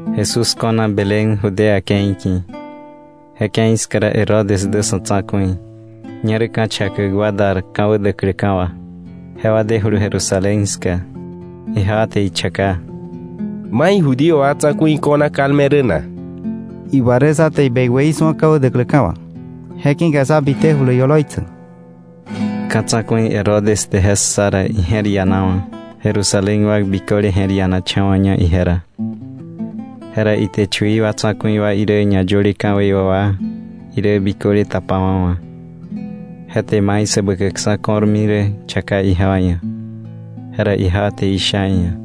Jesús ko̱na Belén, Judea ke̱i ki̱. Je ke̱i ska ra Herodes dä sa̱ tsa̱ku̱i. Ñerä ka̱ chakäk wa dar ka̱wä däkläka̱ wà, jewa dejulu Jerusalén ska. Ijewa te ichaka: —¿Mai Judío wa tsa̱ku̱i ko̱na kalme rä na? Iwa rä sá te ibekwäí su̱a ka̱wä däkläka̱ wà, je ki̱ka sá bitejulu ioloi tsäk. Ka̱ tsa̱ku̱i Herodes te je ssa ra, ije̱r ianawa̱. Jerusalén wa biköle je̱r ianacha̱wa̱ña ije ra. Jera ite chui tsa̱ku̱i wa irä ñayöle ka̱wei wà wa irä biköle tapawa̱wa̱, je te mai Säbäkäkksa̱ ko̱rmi rä chaka ijewa ia̱. Jera ijewa te isha iia̱: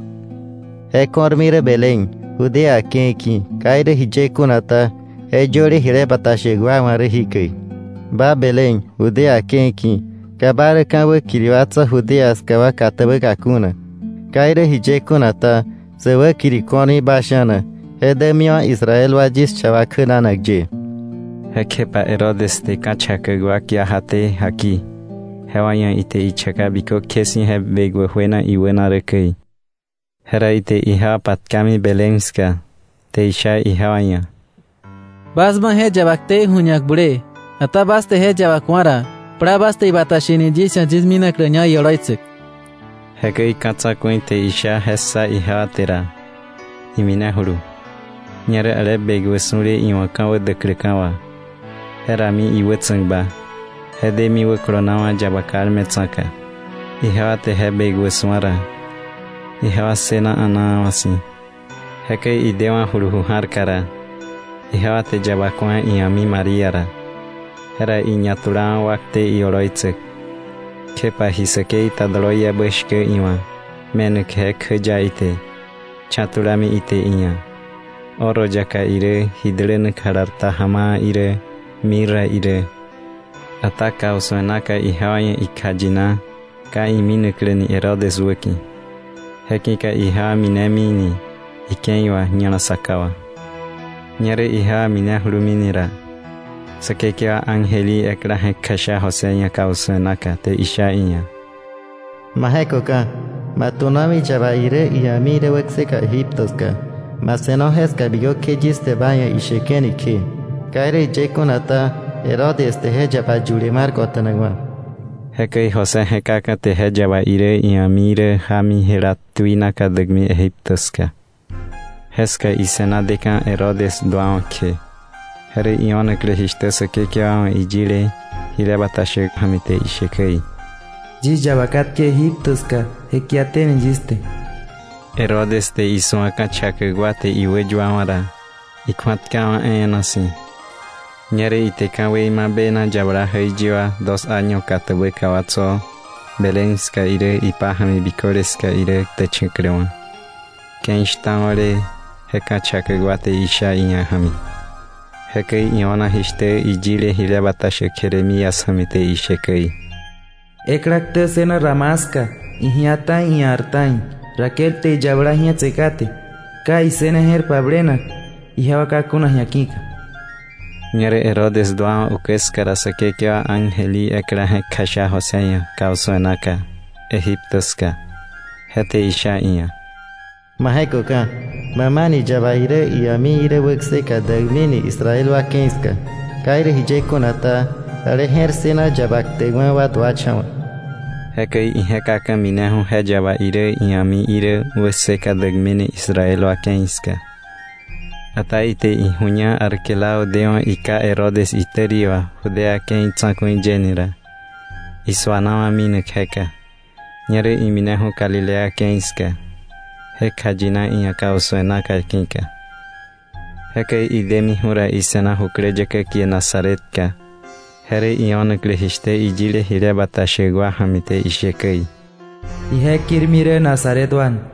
—Je ko̱rmi rä Belén, Judea ke̱i ki̱. Ka irä jiye kuna ta, je yöle jile bata shäk wa̱ rä jikäi: ‘Ba Belén, Judá ke̱i ki̱, ka ba rä ka̱ wäkiri wa tso̱ Judá ska wa katäbäka kuna. Ka irä jiye kuna ta, sä wäkiri ko̱rmi ba sha̱na, je dämiwa̱ Israel wa yis cha wa kjänanak ye.’ Jekjepa Herodes te ka̱ chakäk wa kia jaté jaki jewa ia̱ ite ichaka bikökje si̱ je bekwä juena iwäna rä käi. Jera ite ijewa patkami Belén ska, te isha ijewa ia̱: “Bas ma je yaba ktei ju̱ñak bulee; ata bas te je yaba ku̱a ra, plaa bas te ibata sheni yis ia̱ yis minakläña ioloi tsäk.” Jekäi ka̱ tsa̱ku̱i te isha je ssa ijewa te ra, iminejulu. Ñerä ale bekwä su̱le iwa̱ ka̱wä däkläka̱ wà, je rami iwätsa̱kba, je demi wäkolonawa̱ yaba kalme tsa̱ka. Ijewa te je bekwä su̱a ra, ijewa ssëna a̱naawa̱ si̱. Jekäi idewa̱julu ju ja̱rka ra, ijewa te yaba ku̱a ia̱mi María ra, jera iñatulawa̱ wakte ioloi tsäk, kjepa ji säkei ta doloiebä shkä iwa̱ me̱nak je kjäya ite, cha̱ tulami ite iia̱ oro yaka irä, ji dälänak jalar ta ja̱ma̱a̱ irä, mirra irä. Ata kausu̱e naka ijewa ia̱ ikjayina ka iminaklä ni Herodes wäki̱, je ki̱ka ijewa minemi ni ike̱i wà ña̱la saka wà. Ñerä ijewa minejuluni ra, Säkekewa ángel í ekla je̱k kjasha José ia̱ kausu̱e naka, te isha iia̱: “Ma je̱köka̱, ma tu̱nomi yaba irä ia̱mi irä wäkseka Egipto ska. Ma se̱no jeska bikökje yis te ba ia̱ isheke̱ni kje. Ka irä jiye kuna ta, Herodes te je yaba yule mar kota̱nakwa̱.” Jekäi José je̱kaka̱ te je yaba irä ia̱mi irä jámi jela tuinaka däkmi Egipto ska. Jeska ise̱na deka̱ Herodes duawa̱ kje, je rä io̱naklä jishtä Säkekewa wa̱ iyile jile bata shäk ja̱mi te ishe käi: “Yis yaba katke Egipto ska je kiaté ni yis te.” Herodes te isu̱a ka̱chakäk wa te iwäyuawa̱ ra, ikju̱atkawa̱ e̱e̱na si̱. Ñerä ite ka̱wei ma bena yabala jäiyi wa dos año katäbäka wa tso̱ Belén ska irä ipája̱mi biköle ska irä ktächa̱kläwa̱, ke̱i shtao̱le je ka̱ chakäk wa te isha iia̱ ja̱mi. Jekäi io̱na jishtä iyile jile bata shäk Jeremías ja̱mi te ishe käi: “Ekla ktä ssëna Ramá ska, iji̱á ta̱i ia̱r ta̱i. Raquel te iyabala ji̱etse kate, ka issëne je̱r pablenak ijewa ka kuna ji̱a ki̱ka.” Ñerä Herodes duawa̱ ukä ska ra, Säkekewa ángel í ekla je̱k kjasha José ia̱ kausu̱e naka Egipto ska, je te isha iia̱: “Ma je̱köka̱. Bä ma ni yaba irä ia̱mi irä wäkseka däkmi ni Israel wa ke̱i ska. Ka irä jiye kuna ta, ale je̱r ssëna yaba ktäkwa̱ wa duacha̱wa̱.” Jekäi ije̱kaka̱ mineju̱ je yaba irä ia̱mi irä wäkseka däkmi ni Israel wa ke̱i ska. Ata ite iju̱ña Arquelao dewa̱ iká Herodes itäri wà Judea ke̱i tsa̱ku̱i yeni ra, isu̱anawa̱ minak jeka. Ñerä imineju̱ Galilea ke̱i ska, je kjayina iia̱ kausu̱e naka ki̱ka. Jekäi idemiju̱ ra, ise̱na jukläyäkä kie Nazaretka. Je rä io̱naklä jishtä iyile jile bata shäk wa ja̱mi te ishe käi: Ije kirmi rä Nazaret wa ni.